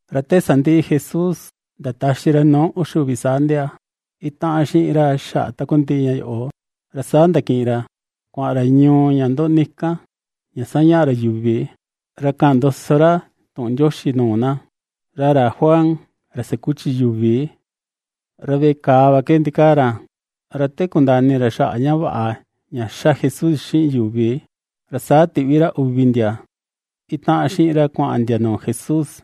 Ra te sandiꞌi Jesús ndataxi ra nuu uxi uvi saa ndia itaꞌan xiꞌin ra xaꞌa takundiꞌi ña yoꞌo, ra saa ndakiꞌin ra kuaꞌan ra ñuu ña ndoꞌni kan ña sañaꞌa ra yuvi, ra kaꞌan ndoso ra tuꞌun Ndioxi nuu na. Ra ra Juan, ra sakuchi yuvi, ra veꞌe kàà va ke ndikaa ra, ra te kundaa ini ra xaꞌa ña vaꞌa ña ^xa Jesús xiꞌin yuvi, ra saa tiꞌvi ra uvi ndia itaꞌan xiꞌin ra kuaꞌan ndia nuu Jesús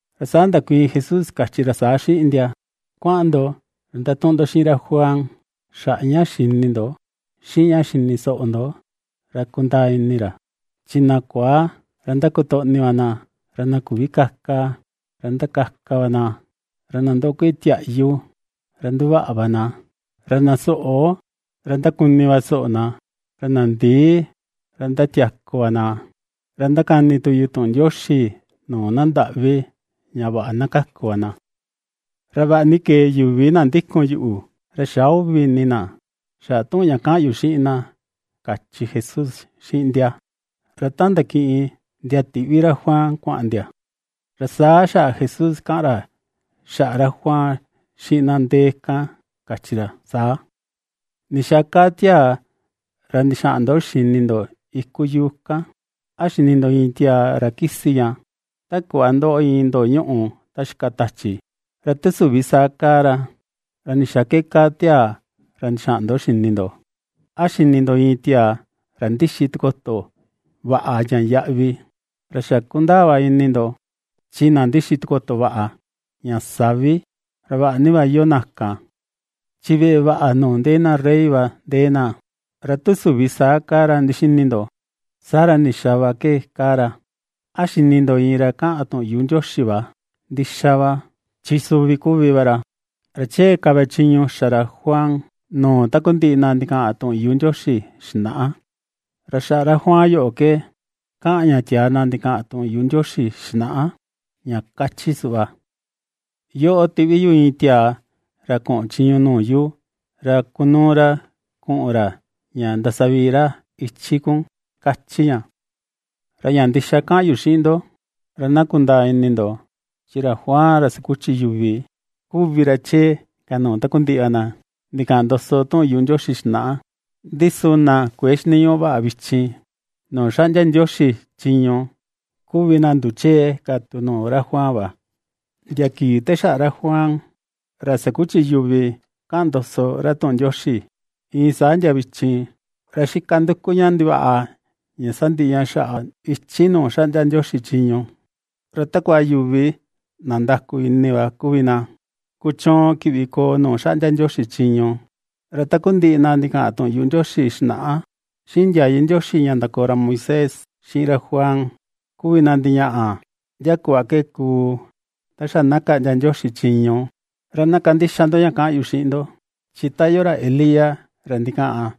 Ra saa ndakuiin Jesús kachi ra saa xiꞌin ndia: ―Kuaꞌan ndo ra ndatuꞌun ndo xiꞌin ra Juan xaꞌa ña ^xini ndo xiꞌin ña ^xini soꞌo ndo ra na kundaa ini ra. Chi na kuaa, ra ^ndakotoꞌni va na, ra na küvi kaka, ra ^ndakaka va na, ra na ndoꞌo kueꞌe tiaꞌyu; ra ^nduvaꞌa va na, ra na soꞌo, ra ^ndakuni va soꞌo na, ra na ndii, ra ^ndatiaku va na. Ra ^ndakani tu yu tuꞌun Ndioxi nuu na ndaꞌvi ña vaꞌa na kaku va na. Ra vaꞌa ni kee yuvi na ndikun yuꞌu, ra xä uvi ini na xaꞌa tuꞌun ña kaꞌan yu xiꞌin na ―kachi Jesús xiꞌin ndia. Ra ta ndakiꞌin ndia tiꞌvi ra Juan kuaꞌan ndia, saa xaꞌa Jesús kaꞌan ra xaꞌa ra Juan xiꞌin na ndee kan kachi ra saa: ―¿Ndixaa kaa tiaa ra ndixaꞌan ndo xini ndo iku yuu kan? ¿A xini ndo iin tiaa ra kisi ña, ta kuꞌva ndoꞌo iin ndoo ñuꞌu ta xika tachi? Ra tu süvi saa kaa ra, ¿ra ndixaa ke kaa tiaa ra ndixaa ndo xini ndo? ¿A xini ndo iin tiaa ra ndixi tikoto vaꞌa ña yaꞌvi? Ra xa kundaa va ini ndo chi na ndixi tikoto vaꞌa, ña savi, ra vaꞌa ni va iyoo na kan, chi veꞌe vaꞌa nuu ndee na rey va ndee na. Ra tu süvi saa kaa ra ndixini ndo, saa ra, ¿ndixaa va ke kaa ra? ¿A xini ndo iin ra kaꞌan tuꞌun yuꞌu Ndioxi va? Ndixa va, chi suvi kuvi va ra; ra chee ka va chiñu ña xa ra Juan nuu takundiꞌi na ndikaꞌan tuꞌun yuꞌu Ndioxi xinaꞌa. Ra xaꞌa ra Juan yoꞌo ke kaꞌan ña tiaa na ndikaꞌan tuꞌun yuꞌu Ndioxi xinaꞌa, ña kachi suꞌva: Yoꞌo tiꞌvi yu iin tiaa ra kuꞌun chiñu nuu yu ra kunuu ra kuꞌun ra, ña ndasavii ra ichi kun, kachi ña. Ra ña ndixa kaꞌan yu xiꞌin ndo, ra na kundaa ini ndo chi ra Juan ra sakuchi yuvi kuvi ra chee ka nuu takundiꞌi va na ndikaꞌan ndoso tuꞌun Ndioxi xinaꞌa. Ndi su na kuëe xiniñuꞌu vaꞌa vichin nuu xaꞌndia Ndioxi chiñu, kuvi na nduchee ka tu nuu ra Juan va. ’Ndia kii te xaꞌa ra Juan, ra sakuchi yuvi kaꞌan ndoso ra tuꞌun Ndioxi, iin saa ndia vichin, ra xika nduku ña ndivaꞌa ña sandiꞌi ña xaꞌa ichi nuu xaꞌndia Ndioxi chiñu, ra takua yuvi na ndaku ini va kuvi na kuchuun kiꞌvi koo nuu xaꞌndia Ndioxi chiñu. Ra takundiꞌi na ndikaꞌan tuꞌun yuꞌu Ndioxi xinaꞌa, xiꞌin ndiayu Ndioxi ña ndakoo ra Moisés, xiꞌin ra Juan, kuvi na ndiñaꞌa ndia kuꞌva ke kuu ta xa na kaꞌndia Ndioxi chiñu. Ra na kandixa ndo ña kaꞌan yu xiꞌin ndo, chi ta iyoo ra Elías ra ndikaꞌan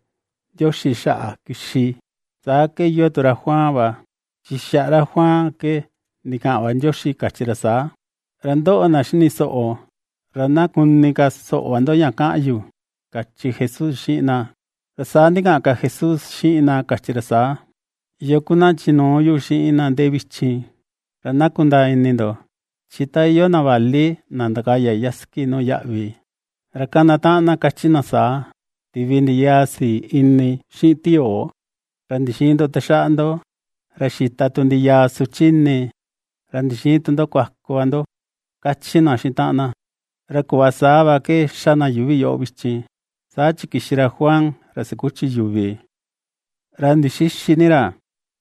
Ndioxi xaꞌa kixi, saa ke iyoo tu ra Juan va. Chi xaꞌa ra Juan ke ndikaꞌan va Ndioxi ña kachi ra saa. Ra ndoꞌo na xini soꞌo, ra ná kuni ka soꞌo va ndo ña kaꞌan yu ―kachi Jesús xiꞌin na. Ra saa ndikaꞌan ka Jesús xiꞌin na kachi ra saa: ―¿Yoo kuvi na chinuu yu xiꞌin na ndee vichin? Ra na kundaa ini ndo chi ta iyoo na vali na ndakaya sasiki nuu yaꞌvi, ra kana taꞌan na kachi na saa: “Tivi ndi yaa sii ini xiꞌin tiyoo ra ndixïin ndo taxaꞌa ndo; ra xita tu ndi yaa suchi ini ra ndixïin tu ndo kuaku va ndo”, ^kachi na xiꞌin taꞌan na, ra kuꞌva saa va ke xa na yuvi yoꞌo vichin. Saa chi kixi ra Juan ra sakuchi yuvi, ra ndixïxi ni ra,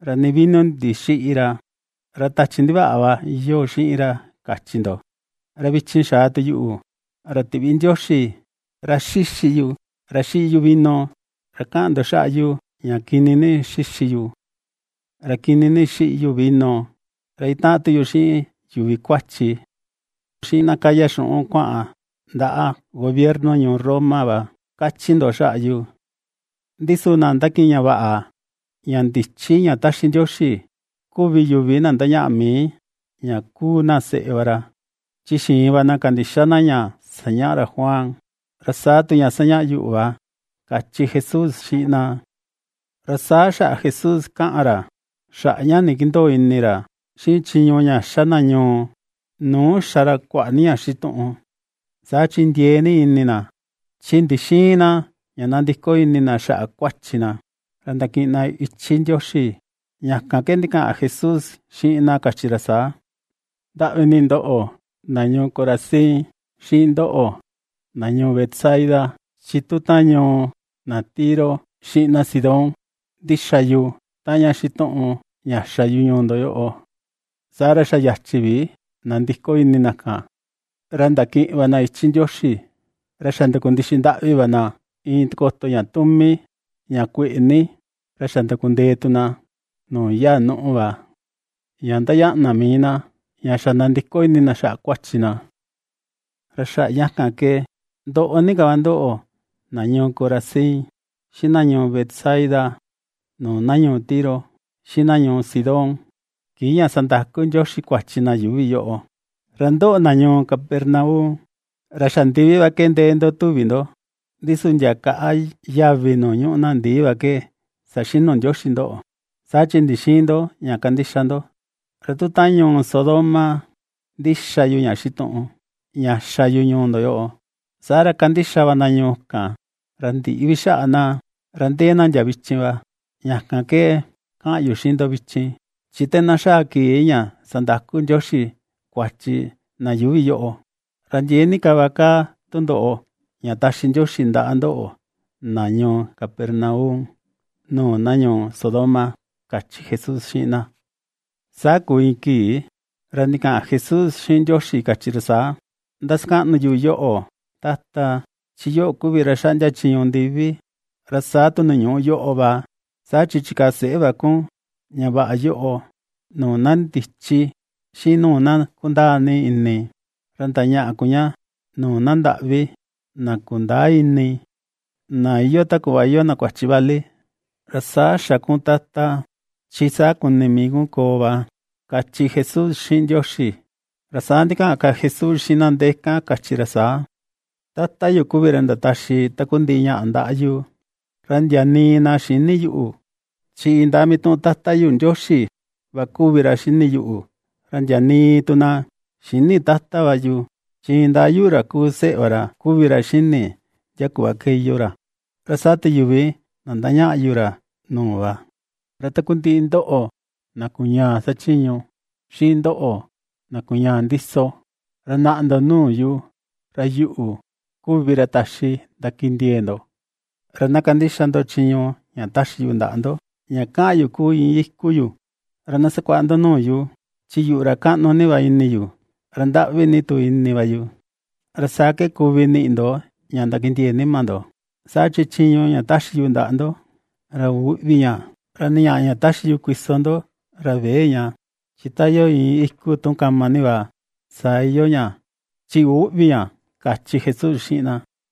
ra nii vino ndixïꞌi ra, ra tachi ndivaꞌa va iyoo xiꞌin ra kachi ndo. Ra vichin xa̱a tu yuꞌu, ra tiꞌvi Ndioxi; ra xíxi yu, ra xiꞌi yu vino, ra kaꞌan ndo xaꞌa yu: ña kini ni xixi yu, ra kini ni xiꞌi yu vino, ra itaꞌan tu yu xiꞌin yuvi kuachi, xiꞌin na kaya xuꞌun kuaꞌan ndaꞌa gobierno ñuu Roma va, kachi ndo xaꞌa yu. Ndi su na ndakiꞌin ña vaꞌa, ña ndichi ña táxi Ndioxi kuvi yuvi na ndañaꞌa mii ña kúu na seꞌe va ra, chi xiin va na kandixa na ña sañaꞌa ra Juan, ra saa tu ña ^sañaꞌa yuꞌu va ―kachi Jesús xiꞌin na. Ra saa xaꞌa Jesús kaꞌan ra xaꞌa ña ndikindöo ini ra xiꞌin chiñu ña ^xa na ñuu nuu xa ra kuaꞌa ni ña xituꞌun, saa chi ndiee ni ini na, chi ndixïin na ña nandiko ini na xaꞌa kuachi na, ra ndakiꞌin na ichi Ndioxi, ña kan ke ndikaꞌan Jesús xiꞌin na kachi ra saa: ―¡Ndaꞌvi ni ndoꞌo, na ñuu Corazín, xiꞌin ndoꞌo, na ñuu Betsaida! Chi tu ta ñuu na Tiro xiꞌin na Sidón, ndixa yu taꞌan ña xituꞌun ña xa yu ñuu ndo yoꞌo, saa ra xa yachi vi nandiko ini na kan ra ndakiꞌin va na ichi Ndioxi; ra xa ndakundixi ndaꞌvi va na iin tikoto ña tumi, ña kueꞌe ni, ra xa ndakundee tu na nuu yaa nuꞌu va, ña ndañaꞌa na mii na ña xa̱ ndandiko ini na xaꞌa kuachi na. Ra xaꞌa ña kan ke ndoꞌo ni ka va ndoꞌo na ñuu Corazín, xiꞌin na ñuu Betsaida, nuu na ñuu Tiro, xiꞌin na ñuu Sidón, kii ña sandaku Ndioxi kuachi na yuuvi yoꞌo. Ra ndoꞌo, na ñuu Capernaum, ra xa ndivi va ke ndee ndo tuvi ndo, ndi su ndia kaꞌa yavi nuu ñuꞌu na ndii va ke saxinu Ndioxi ndoꞌo, saa chi ndixïin ndo ña kandixa ndo. Ra tu taꞌan ñuu Sodoma ndixa yu ña xituꞌun ña xa yu ñuu ndo yoꞌo, saa ra kandixa va na ñuu kan, ra ndïꞌi vi xaꞌa na, ra ndee na ndia vichin va. Ña kan ke kaꞌan yu xiꞌin ndo vichin, chi te na xaa kii ña sandaku Ndioxi kuachi na yuuvi yoꞌo, ra ndiee ni ka va kaa tundoꞌo ña taxi Ndioxi ndaꞌa ndoꞌo na ñuu Capernaum nuu na ñuu Sodoma ―kachi Jesús xiꞌin na. Saa kuu iin kii ra ndikaꞌan Jesús xiꞌin Ndioxi kachi ra saa: ―Ndasakaꞌnu yu yoꞌo, Tata, chi yoꞌo kuvi ra xaꞌndia chiñu ndivi ra saa tu nuu ñuꞌu yoꞌo va, saa chi chikaa seꞌe va kun ña vaꞌa yoꞌo nuu na ndichi xiꞌin nuu na kundaa ni ini, ra ndañaꞌa kun ña nuu na ndaꞌvi, na kundäa ini, na iyoo ta kuꞌva iyoo na kuachi vali. Ra saa xa kun, Tata, chi saa kuni mii kun koo va ―kachi Jesús xiꞌin Ndioxi. Ra saa ndikaꞌan ka Jesús xiꞌin na ndee kan kachi ra saa: ―Tata yu kuvi ra ndataxi takundiꞌi ñáꞌa ndaꞌa yu. Ra ndia nii na xïni yuꞌu; chi indaa mituꞌun Tata yu Ndioxi va kuvi ra xini yuꞌu. Ra ndia nii tu na xïni Tata va yu, chi indaa yuꞌu, ra kuu seꞌe va ra kuvi ra xini ndia kuꞌva ke iyoo ra, ra saa tu yuvi na ndañaꞌa yu ra nuu va. Ra takundiꞌi ndoꞌo, na kuñaa xachiñu, xiꞌin ndoꞌo, na kuñaa ndiso, ra naꞌa ndo nuu yu ra yuꞌu kuvi ra taxi ndakindiee ndo. Ra na kandixa ndo chiñu ña taxi yu ndaꞌa ndo, ña kaꞌan yu kuu iin íku yu, ra na sakuaꞌa ndo nuu yu, chi yuꞌu ra kaꞌnu ni va ini yu, ra ndaꞌvi ni tu ini va yu; ra saa ke kuvi niꞌi ndo ña ndakindiee nima ndo. Saa chi chiñu ña taxi yu ndaꞌa ndo ra üꞌvi ña, ra nii ñaꞌa ña taxi yu kuiso ndo ra vëe ña. Chi ta iyoo iin íku tu kama ni va, saa iyoo ña chi üꞌvi ña ―kachi Jesús xiꞌin na.